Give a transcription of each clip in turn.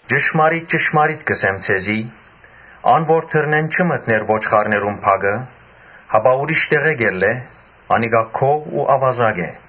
«Ճշմարիտ ճշմարիտ կ’ըսեմ ձեզի. ‘Ան որ դռնէն չի մտներ ոչխարներուն բակը, հապա ուրիշ տեղէ՝ անիկա գող ու աւազակ է’։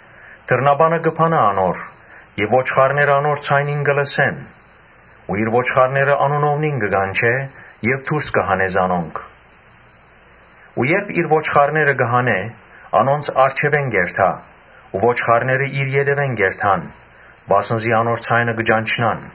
Դռնապանը կը բանայ անոր եւ ոչխարները անոր ձայնը կը լսեն, ու իր ոչխարները անունով կը կանչէ եւ դուրս կը հանէ զանոնք։ Երբ իր ոչխարները կը հանէ, անոնց առջեւէն կ’երթայ ու ոչխարները իր ետեւէն կ’երթան, վասն զի անոր ձայնը կը ճանչնան։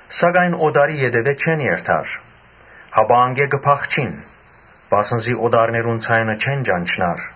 Սակայն օտարի ետեւէն չեն երթար, հապա անկէ կը փախչին, վասն զի օտարներուն ձայնը չեն ճանչնար»։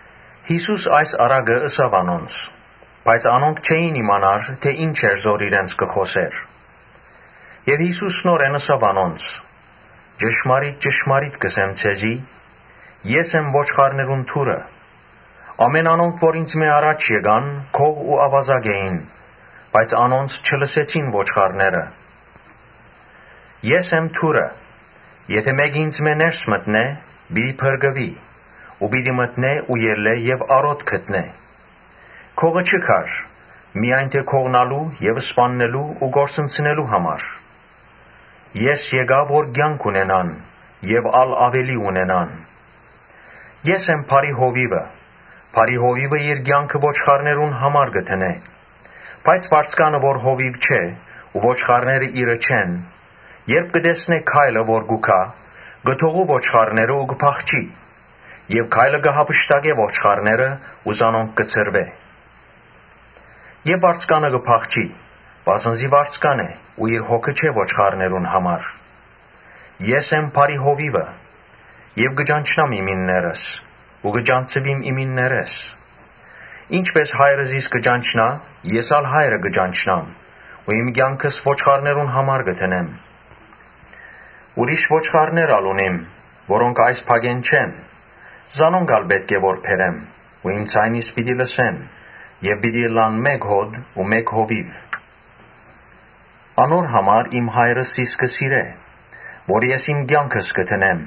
Յիսուս այս առակը ըսաւ անոնց, բայց անոնք չէին իմանար թէ ի՞նչ էր որ իրենց կը խօսէր։ Յիսուս նորէն ըսաւ անոնց. «Ճշմարիտ ճշմարիտ կ’ըսեմ ձեզի. ‘Ես եմ ոչխարներուն դուռը’։ Ամէն անոնք որ ինծմէ առաջ եկան, գող ու աւազակ էին, բայց անոնց չլսեցին ոչխարները։ ‘Ես եմ դուռը’, եթէ մէկը ինծմէ ներս մտնէ, պիտի փրկուի ու պիտի մտնէ ու ելլէ եւ արօտ գտնէ։ Գողը ուրիշ բանի համար չի գար, այլ միայն գողնալու եւ սպաննելու ու կորսնցնելու համար։ Ես եկայ որ կեանք ունենան եւ ա՛լ աւելի ունենան։ ‘Ես եմ բարի հովիւը’. բարի հովիւը իր կեանքը ոչխարներուն համար կը դնէ։ Բայց վարձկանը, որ հովիւ չէ ու ոչխարները իրը չեն, երբ կը տեսնէ որ գայլը կու գայ, կը թողու ոչխարները ու կը փախչի եւ գայլը կը յափշտակէ ոչխարները ու զանոնք կը ցրուէ։ Եւ վարձկանը կը փախչի, վասն զի վարձկան է ու ինք հոգ չ’ըներ ոչխարներուն համար։ Ես եմ բարի հովիւը, կը ճանչնամ իմիններս ու կը ճանչցուիմ իմիններէս։ Ինչպէս Հայրը զիս կը ճանչնայ, ես ալ Հայրը կը ճանչնամ ու իմ կեանքս ոչխարներուն համար կը դնեմ։ Ուրիշ ոչխարներ ալ ունիմ, որոնք այս բակէն չեն. զանոնք ալ պէտք է որ բերեմ ու իմ ձայնիս մտիկ պիտի ընեն եւ ըլլան մէկ հօտ ու մէկ հովիւ։ Անոր համար իմ Հայրս զիս կը սիրէ, որովհետեւ ես իմ կեանքս կը դնեմ,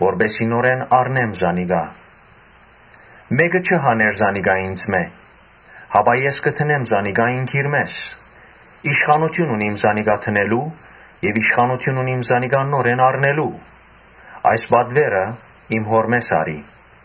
որպէս զի նորէն առնեմ զանիկա։ Մէ՛կը չի հաներ զանիկա ինծմէ, հապա ես կը դնեմ զանիկա ինքնիրմէս։ Իշխանութիւն ունիմ զանիկա դնելու եւ իշխանութիւն ունիմ զանիկա նորէն առնելու. այս պատուէրը իմ Հօրմէս առի»։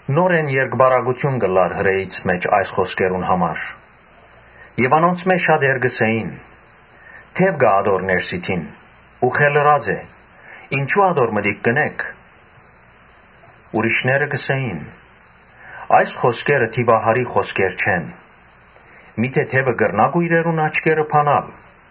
Նորէն պառակտում եղաւ Հրեաներուն մէջ այս խօսքերուն համար։ Անոնցմէ շատեր կ’ըսէին. «Դեւ կայ ատոր ներսիդին ու խենդեցած է. ինչո՞ւ ատոր մտիկ կ’ընէք»։ Ուրիշներ կ’ըսէին. «Այս խօսքերը դիւահարի խօսքեր չեն. միթէ դեւը կրնա՞յ կոյրերուն աչքերը բանալ»։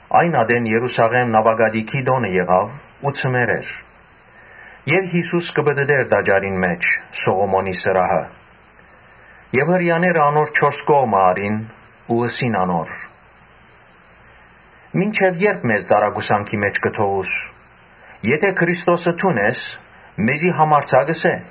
Այն ատեն Երուսաղէմ նաւակատիքի տօն էր։ Ձմեռ էր։ Եւ Յիսուս կը պտըտէր տաճարին մէջ, Սողոմոնին Սրահը։ Հրեաները անոր չորս կողմը առին ու ըսին անոր. «Մինչեւ ե՞րբ մեզ տարակուսանքի մէջ պիտի թողուս. եթէ Քրիստոսը դուն ես, մեզի համարձակ ըսէ»։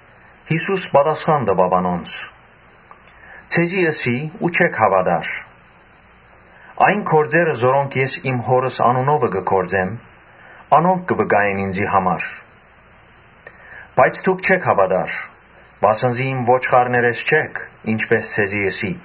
Յիսուս պատասխան տուաւ անոնց. «Ձեզի ըսի ու չհաւատացիք։ Այն գործերը որոնք ես իմ Հօրս անունովը կը գործեմ, անոնք կը վկայեն ինծի համար։ Բայց դուք չէք հաւատար, վասն զի իմ ոչխարներէս չէք, Ոմանք չունինինչպէս ձեզի ըսի՝ ՝։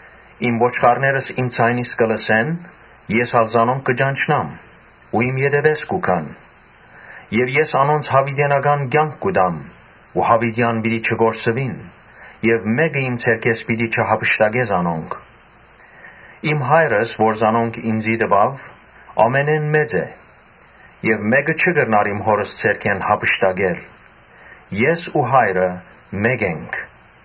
Իմ ոչխարներս իմ ձայնս կը լսեն ու ես ալ զանոնք կը ճանչնամ ու իմ ետեւէս կու գան։ Ես անոնց յաւիտենական կեանք կու տամ ու յաւիտեան պիտի չկորսուին եւ մէ՛կը իմ ձեռքէս պիտի չյափշտակէ զանոնք։ Իմ Հայրս, որ զանոնք ինծի տուաւ, բոլորէն մեծ է եւ մէ՛կը չի կրնար իմ Հօրս ձեռքէն յափշտակել։ Ես ու Հայրը մէկ ենք»։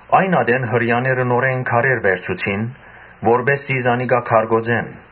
Այն ատեն Հրեաները նորէն քարեր վերցուցին, որպէս զի զանիկա քարկոծեն։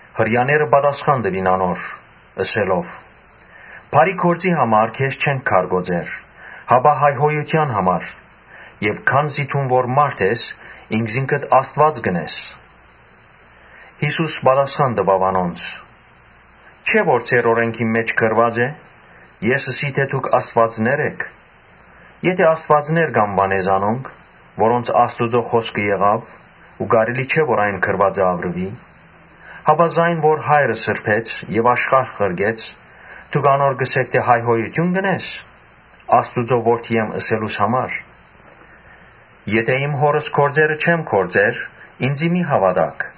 Հրեաները պատասխան տուին անոր՝ ըսելով. «Բարի գործի համար քեզ չենք քարկոծեր, հապա հայհոյութեան համար, քանզի դուն որ մարդ ես, ինքզինքդ Աստուած կ’ընես»։ Յիսուս պատասխան տուաւ անոնց. «Չէ՞ որ ձեր օրէնքին մէջ գրուած է. ‘Ես ըսի թէ դուք աստուածներ էք’։ Եթէ աստուածներ կ’անուանէ զանոնք, որոնց Աստուծոյ խօսքը տրուեցաւ, (ու կարելի չէ որ այն գրուածը աւրուի,) Հապա զայն որ Հայրը սրբեց եւ աշխարհ ղրկեց, դուք ինչպէ՞ս անոր կ’ըսէք թէ՝ ‘Հայհոյութիւն կ’ընես’, ‘Աստուծոյ Որդի եմ’ ըսելուս համար։ Եթէ իմ Հօրս գործերը չեմ գործեր, ինծի մի՛ հաւատաք։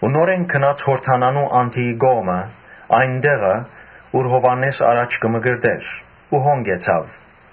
Նորէն գնաց Յորդանանի անդիի կողմը, այն տեղը, ուր Յովհաննէս առաջ կը մկրտէր ու հոն կեցաւ։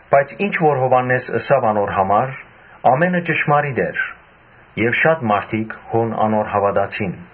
Բայց ինչ որ Յովհաննէս ըսաւ ասոր համար՝ ամէնը ճշմարիտ էր»։ Եւ շատ մարդիկ հոն անոր հաւատացին։